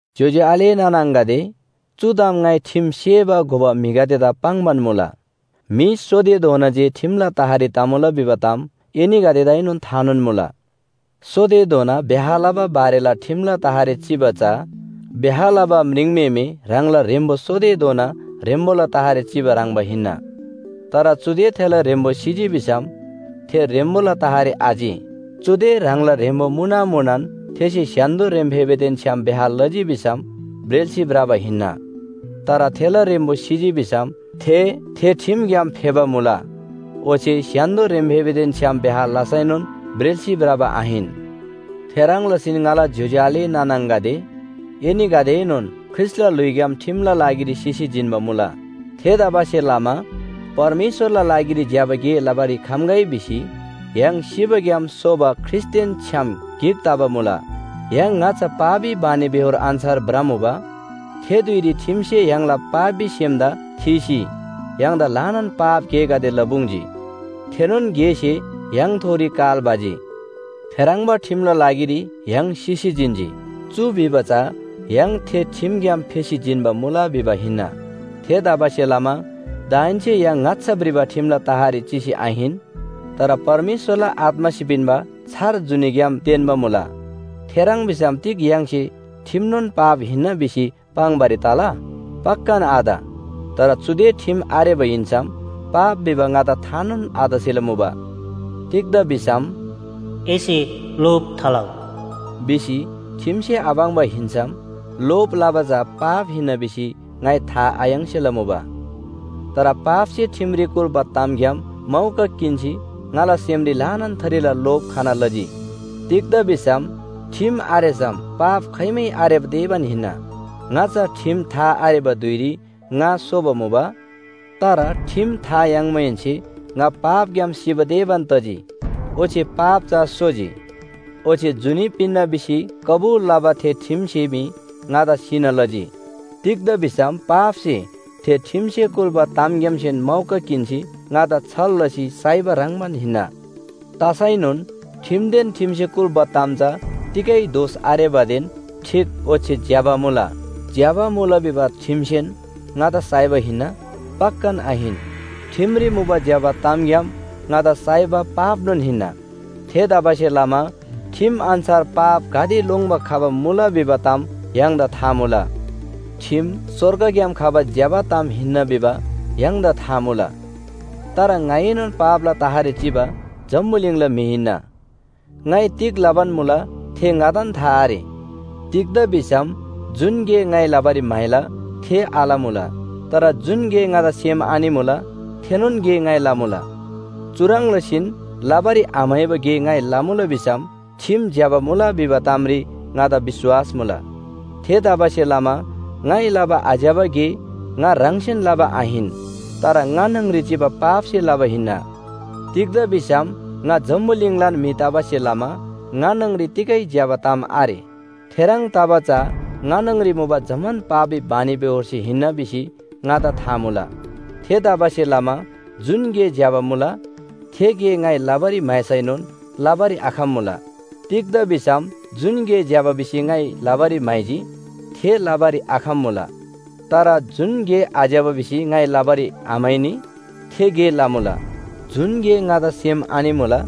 ज्‍योज्‍यो आले नाना आङागदे, चु ताम ङाइ ठिम सेबा घोबा म्‍हिगदेदा पाङ्‌बान मुला। म्‍हि सोतेधोना जे ठिमला तहरी तमुला भिबा ताम एनीगदेदाएनोन थानोन मुला। सोतेधोना ब्‍याह लबा बारेला ठिमला तहरी चिबा चा, ब्‍याह लबा म्रिङम्‍हेमे ह्राङला ह्रेम्‍बो सोतेधोना ह्रेम्‍बोला तहरी चिबा ह्रङ्‌बा हिन्‍ना। तर चुदे थेला ह्रेम्‍बो सिजी भिसम थे ह्रेम्‍बोला तहरी आचि। चुदे ह्राङला ह्रेम्‍बो मुना मुनान थेसे स्‍य्‍हान्‍दो ह्रेम्‍फेबेदेन छ्‌याम ब्‍याह लजी भिसम ब्रेल्‍सी भ्रबा हिन्‍ना। तर थेला ह्रेम्‍बो सिजी भिसम थे, थे ठिमग्‍याम फेबा मुला, ओच्‍छे स्‍य्‍हान्‍दो ह्रेम्‍फेबेदेन छ्‌याम ब्‍याह लसैनोन ब्रेल्‍सी भ्रबा आहिन। थेह्रङ् लसीन ङाला ज्‍योज्‍यो आले नाना आङागदे, एनीगदेएनोन ख्रीष्‍टला ल्‍हुइग्‍याम ठिमला लागिरी सिसी जिन्‍बा मुला। थेतबासेलमा परमेश्‍वरला लागिरी ज्‍यबा गे लबारी खम्‍गै भिसी य्‍हाङ सिबाग्‍याम सोबा ख्रीष्‍टदेन छ्‌याम गिक तबा मुला। य्‍हाङ ङाच्‍छा पापी बानीबेहोर अन्‍छार भ्रमुबा। थे धुइरी ठिमसे य्‍हाङला पापी सेमदा थीसी य्‍हाङदा ल्‍हानान पाप गेगदे लपुङ्जी। थेनोन गेसे य्‍हाङथोरी काल भजी। थेह्रङ्बा ठिमला लागिरी य्‍हाङ सिसी जिन्‍जी। चु भिबा चा य्‍हाङ थे ठिमग्‍याम फेसी जिन्‍बा मुला भिबा हिन्‍ना। थेतबासेलमा दाहेन्‍से य्‍हाङ ङाच्‍छा भ्रिबा ठिमला तहरी चिसी आहिन, तर परमेश्‍वरला आत्‍मासे पिन्‍बा छार जुनीग्‍याम तेन्‍बा मुला। थेह्रङ् भिसम तिग य्‍हाङसे ठिमनोन पाप हिन्‍ना भिसी पाङ्‌बारी तला? पक्‍कान आत। तर चुदे ठिम आरेबा हिन्‍सम पाप भिबा ङादा थानोन आतसेला मुबा। तिग्‍दा भिसम “एसे लोभ थालउ” भिसी ठिमसे आपाङ्बा हिन्‍सम लोभ लबा चा पाप हिन्‍ना भिसी ङाइ था आयाङ्सेला मुबा। तर पापसे ठिमरी कुल्‍बा तामग्‍याम मौका किन्‍सी ङाला सेमरी ल्‍हानान थरीला लोभ खना लजी। तिग्‍दा भिसम ठिम आरेसम पाप खाइमै आरेबा तेबान हिन्‍ना। ङाच्‍छा ठिम था आरेबा धुइरी ङा सोबा मुबा। तर ठिम था याङ्माहेन्‍से ङा पापग्‍याम सिबा तेबान तजी ओच्‍छे पाप चा सोजी। ओच्‍छे जुनी पिन्‍ना भिसी कबुल लबा थे ठिमसे मी ङादा सिना लजी। तिग्‍दा भिसम पापसे थे ठिमसे कुल्‍बा तामग्‍यामसेन मौका किन्‍सी ङादा छल लसी साइबा ह्रङ्‌बान हिन्‍ना। तसैनोन ठिमदेन ठिमसे कुल्‍बा ताम चा तिगै दोष आरेबादेन ठीक ओच्‍छे ज्‍यबा मुला। ज्‍यबा मुला भिबा ठिमसेन ङादा साइबा हिन्‍ना? पक्‍कान आहिन। ठिमरी मुबा ज्‍यबा तामग्‍याम ङादा साइबा पापनोन हिन्‍ना। थेतबासेलमा ठिम अन्‍छार पाप गाते लोङ्‌बा खबा मुला भिबा ताम य्‍हाङदा था मुला। ठिम स्‍वर्गग्‍याम खबा ज्‍यबा ताम हिन्‍ना भिबा य्‍हाङदा था मुला। तर ङाएनोन पापला तहरी चिबा जम्‍बुलिङला म्‍हि हिन्‍ना। ङाइ तिग लबान मुला थे ङादान था आरे। तिग्‍दा भिसम जुन गे ङाइ लबारी म्‍हाइला थे आलमुला। तर जुन गे ङादा सेम आनिमुला थेनोन गे ङाइ लमुला। चुह्रङ् लसीन लबारी आम्‍हाइबा गे ङाइ लमुला भिसम ठिम ज्‍यबा मुला भिबा तामरी ङादा विश्‍वास मुला। थेतबासेलमा ङाइ लबा आज्‍यबा गे ङा ह्राङसेन लबा आहिन। तर ङा न्‍हङरी चिबा पापसे लबा हिन्‍ना। तिग्‍दा भिसम ङा जम्‍बुलिङलान म्‍हि तबासे लमा ङा न्‍हङरी तिगै ज्‍यबा ताम आरे, थेह्रङ् तबा चा ङा न्‍हङरी मुबा जम्‍मान पापी बानीबेहोरसे हिन्‍ना भिसी ङादा था मुला। थेतबासेलमा जुन गे ज्‍यबा मुला, थे गे ङाइ लबारी म्‍हाइसैनोन लबारी आखम्‍मुला। तिग्‍दा भिसम जुन गे ज्‍यबा भिसी ङाइ लबारी म्‍हाइजी थे लबारी आखम्‍मुला। तर जुन गे आज्‍यबा भिसी ङाइ लबारी आम्‍हाइनी थे गे लमुला। जुन गे ङादा सेम आनिमुला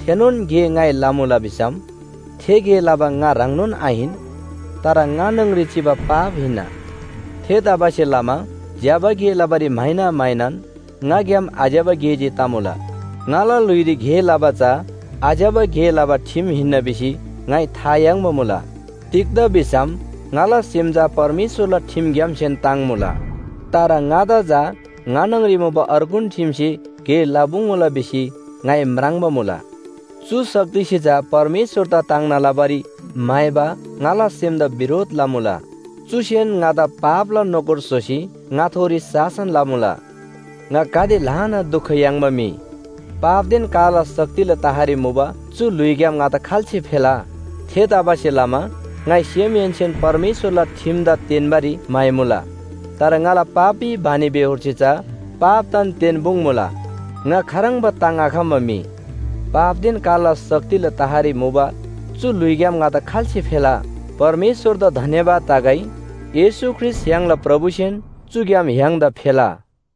थेनोन गे ङाइ लमुला भिसम थे गे लबा ङा ह्राङनोन आहिन। तर ङा न्‍हङरी चिबा पाप हिन्‍ना। थेतबासेलमा ज्‍यबा गे लबारी म्‍हाइना म्‍हाइनान ङाग्‍याम आज्‍यबा गे जे तमुला। ङाला ल्‍हुइरी गे लबा चा आज्‍यबा गे लबा ठिम हिन्‍ना भिसी ङाइ था याङ्बा मुला। तिग्‍दा भिसम ङाला सेम चा परमेश्‍वरला ठिमग्‍यामसेन ताङ्मुला। तर ङादा चा ङा न्‍हङरी मुबा अर्गुन ठिमसे गे लपुङ्मुला भिसी ङाइ म्राङ्बा मुला। चु शक्तिसे चा परमेश्‍वरदा ताङ्ना लबारी म्‍हाइबा ङाला सेमदा बिरोध लमुला। चुसेन ङादा पापला नोकर स्‍होसी ङाथोरी शासन लमुला। ङा गाते ल्‍हाना दुख याङ्बा म्‍हि, पापदेन कालला शक्तिला तहरी मुबा चु ल्‍हुइग्‍याम ङादा खाल्‍से फेला? थेतबासेलमा ङाइ सेमहेन्‍सेन परमेश्‍वरला ठिमदा तेन्‍बारी म्‍हाइमुला, तर ङाला पापी बानीबेहोरसे चा पापदान तेन्‍पुङ्मुला। ङा खाह्रङ्बा ताङ्‍आखम्‍बा म्‍हि, पापदेन कालला शक्तिला तहरी मुबा चु ल्‍हुइग्‍याम ङादा खाल्‍से फेला? परमेश्‍वरदा धन्‍यवाद तगै। येशू ख्रीष्‍ट य्‍हाङला प्रभुसेन चुग्‍याम य्‍हाङदा फेला।